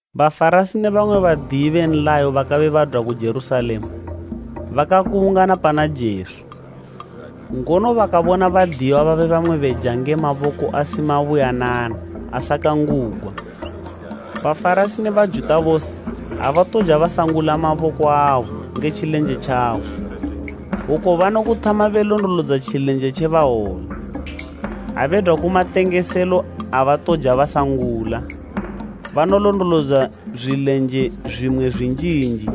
Bafarasi ne bamwe Badiyi be nlayo bakabe badwa ku Jerusalema bakakubungana pana Jesu. Ngono bakabona badiyiwa babe bamwe beja nge maboko asimabuyanana, asakangugwa. Bafarasi ne Bajuta bose, abatoja basangula maboko abo nge tjilenje tjabo. Oku banokuthama belondolodza tjilenje tje bawola. Ha bedwa ku matengeselo abatoja basangula. Banolondolodza zwilenje zwimwe zwinjinji,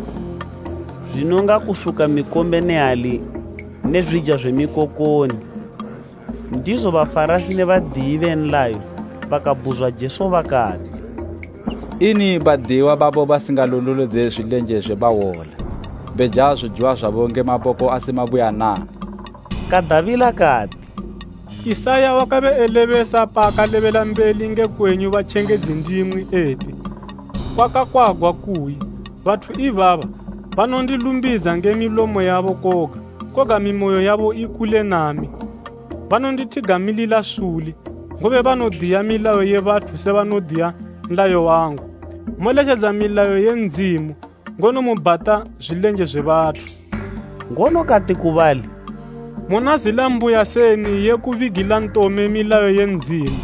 zwinonga kusuka mikombe ne hali ne zwija zwe phangula. Ndizo Bafarasi ne Badiyi be nlayo bakabhuzwa Jesu bakati, “Ini badiyiwa babo basingalondolodze zwilenje zwe bawola, beja zojiwa zwabo nge maboko asi mabuyanana?” Kadabila kati, “Isaya wakabe elebesa paakalebela mbeli nge kwenyu batjengedzi ndimwi eti, kwakakwagwa kuyi, “ ‘Bathu ibaba banondilumbidza nge milomo yabo koga, koga mimoyo yabo ikule nami. Banondithigamilila suli, ngobe banodiya milayo ye bathu se banodiya nlayo wangu.’ “Moletjedza milayo ye Ndzimu, ngono mubhata zwilenje zwe bathu.” Ngono kati ku bali, “Muna zila mbuya seni ye kubigila ntome milayo ye Ndzimu,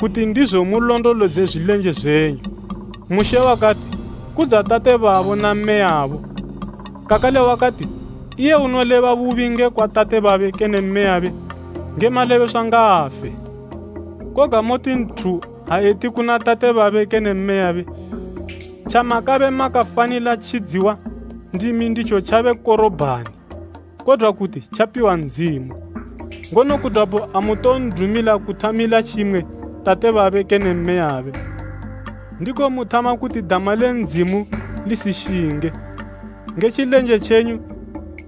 kuti ndizo mulondolodze zwilenje zwenyu! Mushe wakati, ‘Kudza tate babo na mmeyabo.’ Kakale wakati ‘Iye unoleba bubi ngekwa tate babe kene mmeyabe, nge malebeswa ngaafe.’ Koga moti nthu ha eti kuna tate babe kene mmeyabe, ‘Tjamakabe makafanila tjidziwa ndimi nditjo tjabe Korobhani, kodwa kuti tjapiwa Ndzimu,’ ngono kudwapo amuton'dumila kuthamila tjimwe tate babe kene mmeyabe. Ndiko muthama kuti dama le Ndzimu lisishinge, nge tjilenje tjenyu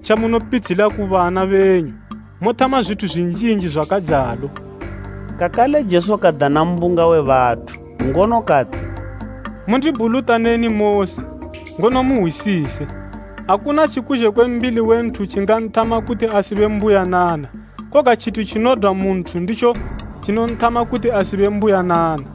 tjamunopitshila ku bana benyu. Mothama zwithu zwinjinji zwakajalo.” Kakale Jesu kadana mbunga we bathu, ngono kati, “Mundibhulutaneni mose, ngono muhwisise. Akuna tjikuzhe kwe mbili we nthu tjinganthama kuti asibe mbuyanana. Koga tjithu tjinodwa mu nthu nditjo tjinonthama kuti asibe mbuyanana.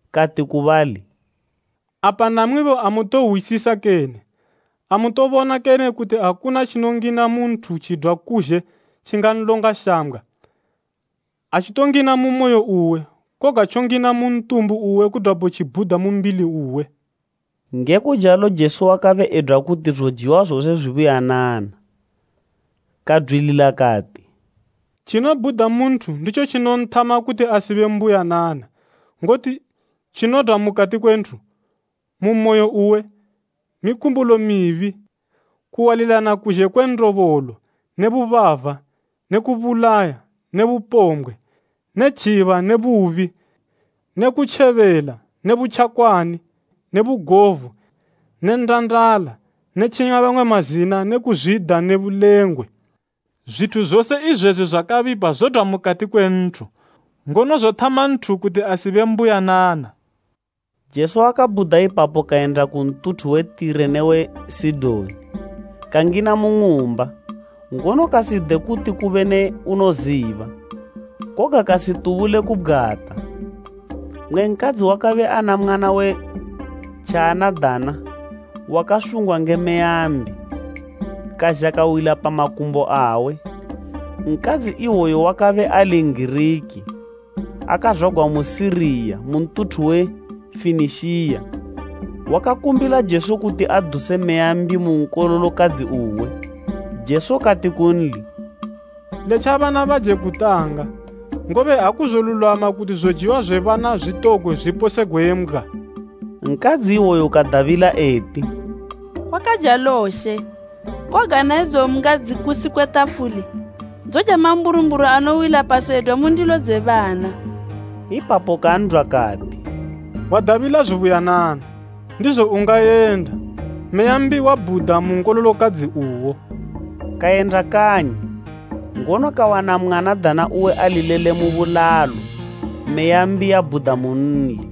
Kati ku bali, “Apa namwibo amutohwisisa kene? Amutobona kene kuti akuna tjinongina mu nthu tjidwa kuzhe tjinganlonga shambgwa? Atjitongina mu moyo uwe, koga tjongina mu ntumbu uwe kudwapo tjibhuda mu mbili uwe.” Nge kujalo Jesu wakabe edwa kuti zojiwa zose zwibuyanana. Kadwilila kati, “Tjinobhuda mu nthu nditjo tjinonthama kuti asibe mbuyanana. Ngoti tjinodwa mukati kwe nthu, mu moyo uwe, mikumbulo mibi, kuwalilana kuzhe kwe ndobolo ne bubava ne kubulaya ne bupombwe, ne tjiba ne bubi ne kutjebela ne butjakwani ne bugovu ne ndandala ne tjinya bamwe mazina ne kuzwida ne bulengwe. Zwithu zose izwezwi zwakabipa zodwa mukati kwe nthu, ngono zothama nthu kuti asibe mbuyanana.” Jesu wakabhuda ipapo kayenda ku ntuthu we Tire ne we Sidoni, kangina mu ng'umba, ngono kaside kuti kube ne unoziba, koga kasitubule kubgwata. Mmwe nkadzi wakabe ana mwana we tjianadana wakasungwa nge meya mbi, kazha kawila pa makumbo awe. Nkadzi iwoyo wakabe ali N'giriki, akazwagwa mu Siriya mu ntuthu we Fenishiya. Wakakumbila Jesu kuti aduse meya mbi mu nkololokadzi uwe. Jesu kati kunli, “Letja bana baje kutanga, ngobe akuzolulwama kuti zojiwa zwe bana zwitogwe zwiposegwe mbgwa.” Nkadzi iwoyo kadabila eti, “Kwakajalo She, koga na idzo mbgwa dzikusi kwe tafuli, dzoja mamburumburu anowila pasi edwa mu ndilo dze bana.” Ipapo kan'dwa kati, “Wadabila zubuyanana, ndizo ungayenda, meya mbi yabhuda mu nkololokadzi uwo.” Kayenda kanyi, ngono kawana mwanadana uwe ali lele mu bulalo meya mbi yabhuda munli.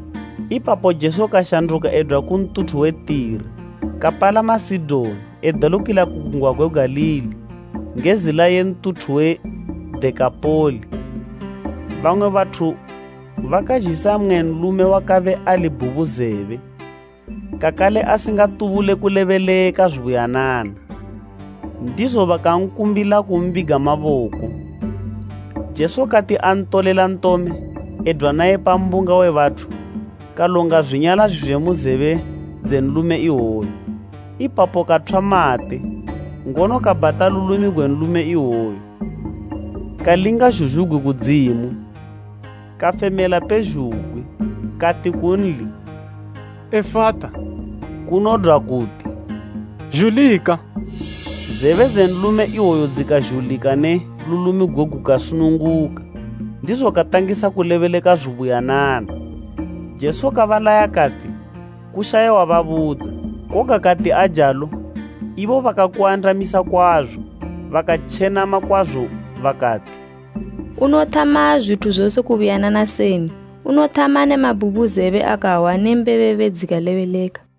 Ipapo Jesu kashanduka edwa ku ntuthu we Tire, kapalama Sidoni edelukila ku gungwa gwe Galili nge zila ye ntuthu we Dekapoli. Dekapoli: Kodwa kuti, “Mizi ili gumi.” Bamwe bathu bakazhisa mmwe nlume wakabe ali bhubuzebe, kakale asingatubule kulebeleka zubuyanana. Ndizo bakakumbila Jesu kumbiga maboko. Jesu kati antolela ntome, edwa naye pa mbunga we bathu, kalonga zwinyala zwizwe mu zebe dze nlume iwoyo. Ipapo kathwa mate, ngono kabhata lulimi gwe nlume iwoyo. Kalinga zhuzhugwi kudzimu, kafemela pezhugwi, kati kunli, “Efata” kunodwa kuti, “Zhulika.” Zebe dze nlume iwoyo dzikazhulika ne lulimi gugwe gukasununguka, ndizo katangisa kulebeleka zubuyanana. Jesu kabalaya kati kushaye wababudza. Koga kati ajalo ibo bakakuandamisa kwazo. Bakatjenama kwazo bakati, “Unothama zwithu zose kubuyanana seni? Unothama ne mabhubuzebe akahwa ne mbebebe dzikalebeleka.”